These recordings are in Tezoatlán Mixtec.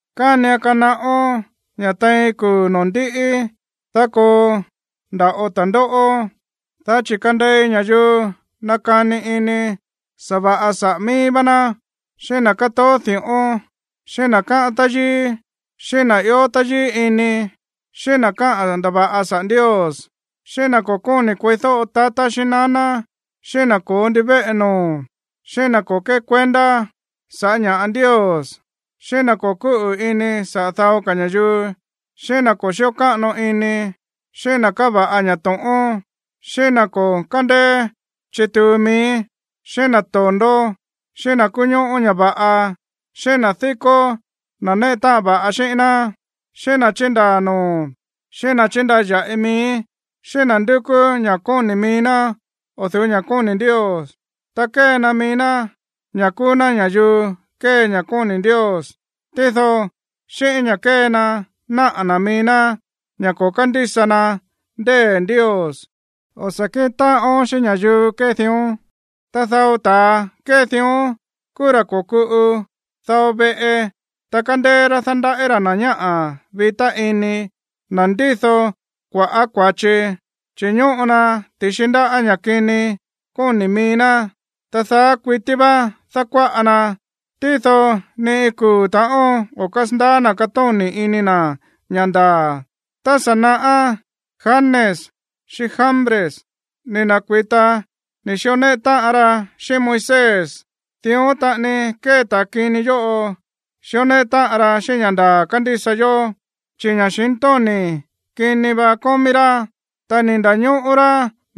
Kánian kanaꞌón ña̱ tein kuu̱ noo̱ ndíꞌí, dá koo nda̱ꞌo ta̱ndóꞌó. Dá chi̱ kandei ña̱yuu nakani ini sa̱va̱ꞌa saꞌa̱ mií vá ná, xíꞌín na̱ katoó di̱ꞌón, xíꞌín na̱ kaꞌa̱n táyíí, xíꞌín na̱ ió táyíí ini, xíꞌín na̱ kaꞌa̱n ndava̱ꞌa saꞌa̱ Ndios, xíꞌín na̱ ko̱ koni̱ kueídóꞌo tatá xíꞌín naná, xíꞌín na̱ ko̱ó ndivéꞌe noo̱, xíꞌín na̱ o̱ kékuendá sa̱ꞌá ña̱ꞌa Ndios, xíꞌín na̱ o̱ kúꞌu̱ ini saꞌa̱ dao ka̱ ña̱yuu, xíꞌín na̱ o̱ kíꞌo káꞌano ini, xíꞌín na̱ kava̱ꞌa ña̱ to̱ꞌón, xíꞌín na̱ o̱ kándeé chituu mií, xíꞌín na̱ to̱ndó, xíꞌín na̱ kuñóꞌó ña̱ va̱ꞌa, xíꞌín na̱ dikó na̱ néꞌe táꞌan va̱ꞌa xíꞌín ná, xíꞌín na̱ chindaa̱ noo̱, xíꞌín na̱ chindaya̱ꞌi mií, xíꞌín na̱ ndukú ña̱ kóni̱ mií ná o̱ du̱ú ña̱ kóni̱ Ndios. Ta kee na mií ná ña̱ kúú ná ña̱yuu kée ña̱ kóni̱ Ndios, tído xíꞌín ña̱ kee na naꞌa̱ na̱ mií ná ña̱ ko̱ kándísa na ndée̱ Ndios. O̱ sa̱ kíꞌin táꞌón xíꞌín ña̱yuu kée dión. Ta dao ta̱a kée dión kúú ra̱ ko̱kuꞌu dao veꞌe, ta kándéé rá dándaꞌí ra̱ na̱ ñáꞌa̱ vitá ini, na̱ ndído kua̱ꞌá kua̱chi, chi̱ ñóꞌo na ti̱xi ndáꞌa̱ ña̱ kini kóni̱ mií ná. Ta daá kuití vá dákuáꞌa na, tído ni kuu̱ ta̱ꞌón o̱ kásandaá na̱ katóni̱ ini na̱ ña̱ ndaa̱. Tá sa̱ naꞌá, Janes xíꞌín Jambres ni̱ na̱kui̱ta ni̱ xió néꞌe táꞌan ra xíꞌín Moisés. Dión taꞌani kée ta̱a kini yóꞌo xíó néꞌe táꞌan ra xíꞌín ña̱ ndaa̱ kándísa yó, chi̱ ña̱xintóni̱ kini va kómí rá, ta ni̱ nda̱ñóꞌó rá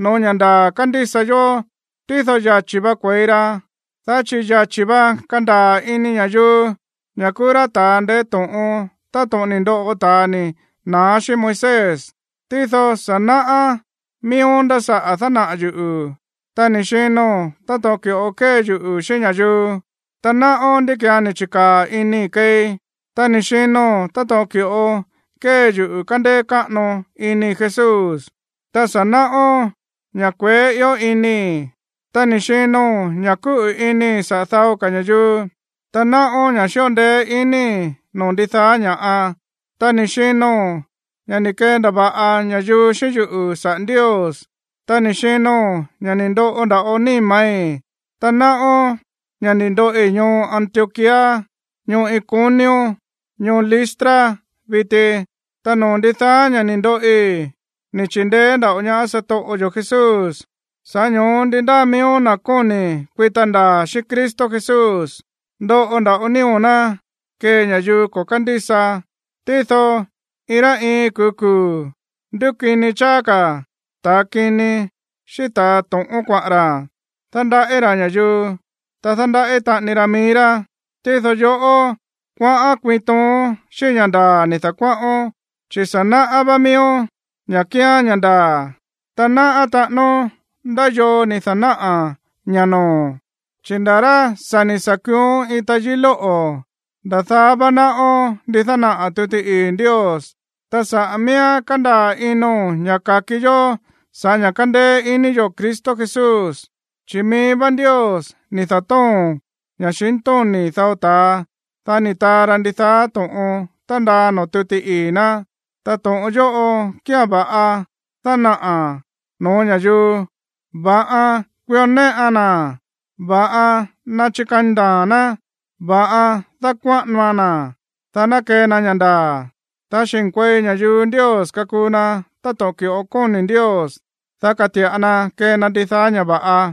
no̱ó ña̱ ndaa̱ kándísa yó. Tído yachi̱ vá kue̱i ra, dá chi̱ yachi̱ vá kandaa̱ ini ña̱yuu ña̱ kúú rá ta̱a ndeé to̱ꞌon táto̱ꞌon ni̱ ndoꞌo ta̱a ni̱ na̱á xíꞌín Moisés. Tído sa̱ náꞌá miíón ndá saꞌa̱ dánaꞌa̱ yuꞌu̱, ta ni̱ xino̱n táto̱ꞌon ki̱ꞌo kée yuꞌu̱ xíꞌín ña̱yuu, ta náꞌón ndí ki̱án ni̱ chi̱kaa̱ inii̱ keei, ta ni̱ xino̱n táto̱ꞌon ki̱ꞌo kée yuꞌu̱ kándéé káꞌano inii̱ Jesús, ta sa̱ náꞌón ña̱ kueé ió inii̱, ta ni̱ xino̱n ña̱ kúꞌu̱ inii̱ saꞌa̱ dao ka̱ ña̱yuu, ta náꞌón ña̱ xíꞌo ndeé iníi̱ noo̱ ndidaá ña̱ꞌa, ta ni̱ xino̱n ña̱ ni̱ kendava̱ꞌa ña̱yuu xíꞌín yuꞌu̱ saꞌa̱ Ndios, ta ni̱ xino̱n ña̱ ni̱ ndoꞌo nda̱ꞌo níma̱í. Ta náꞌón ña̱ ni̱ ndoꞌi ñoo Antioquía, ñoo Iconio, ñoo Listra viti. Ta noo̱ ndidaá ña̱ ni̱ ndoꞌi, ni̱ chi̱ndeé nda̱ꞌo ñaá satoꞌo yo̱ Jesús. Sa̱ꞌá ño̱ó ndi ndáa miíó na̱ kóni̱ kuita ndaa̱ xíꞌín Cristo Jesús, ndoꞌo nda̱ꞌo nío̱ ná kee ña̱yuu ko̱ kándísa. Tído iin rá iin kuu̱ kuu̱, ndúkini cháá ka̱ ta̱ kini xíꞌín ta̱ to̱ꞌón kuaꞌa̱n ra̱, ta dándaꞌí ra̱ ña̱yuu, ta dándaꞌí táꞌan mií rá. Tído yoꞌó, kuaꞌán kuiin toon xíꞌín ña̱ ndaa̱ ni̱ da̱kuáꞌón, chi̱ sa̱ náꞌá vá miíón ña̱ kíán ña̱ ndaa̱, ta náꞌá taꞌánón ndá yoo ni̱ da̱náꞌa̱ ña̱ noo̱o̱n. Chi̱ nda̱ rá ni̱ sa̱ kuuón iin tayií lóꞌo̱, nda̱ daá vá náꞌón ndí dánaꞌa̱ tuti ii̱ Ndios, ta saꞌa̱ miíán kándaa̱ ino̱n ña̱ ka̱ki yó saꞌa̱ ña̱ kándéé iní yo̱ Cristo Jesús. Chi̱ mií vá Ndios ni̱ da̱tóo̱n ña̱xintóni̱ dao ta̱a, dá ni̱ taa ra ndidaá to̱ꞌon tándaa noo̱ tuti ii̱ ná. Ta to̱ꞌon yóꞌo kía̱n va̱ꞌan dánaꞌa̱a̱n no̱ó ña̱yuu, va̱ꞌan kuió néꞌan na̱, va̱ꞌan ná chikani ndaa̱a̱n ná, va̱ꞌan dákuáꞌanoan na̱, dá ná kee na ña̱ ndaa̱, dá xi̱nkuei ña̱yuu Ndios kakuu na táto̱ꞌon ki̱ꞌo kóni̱ Ndios, dá kati̱ꞌa na kee na ndidaá ña̱ va̱ꞌa.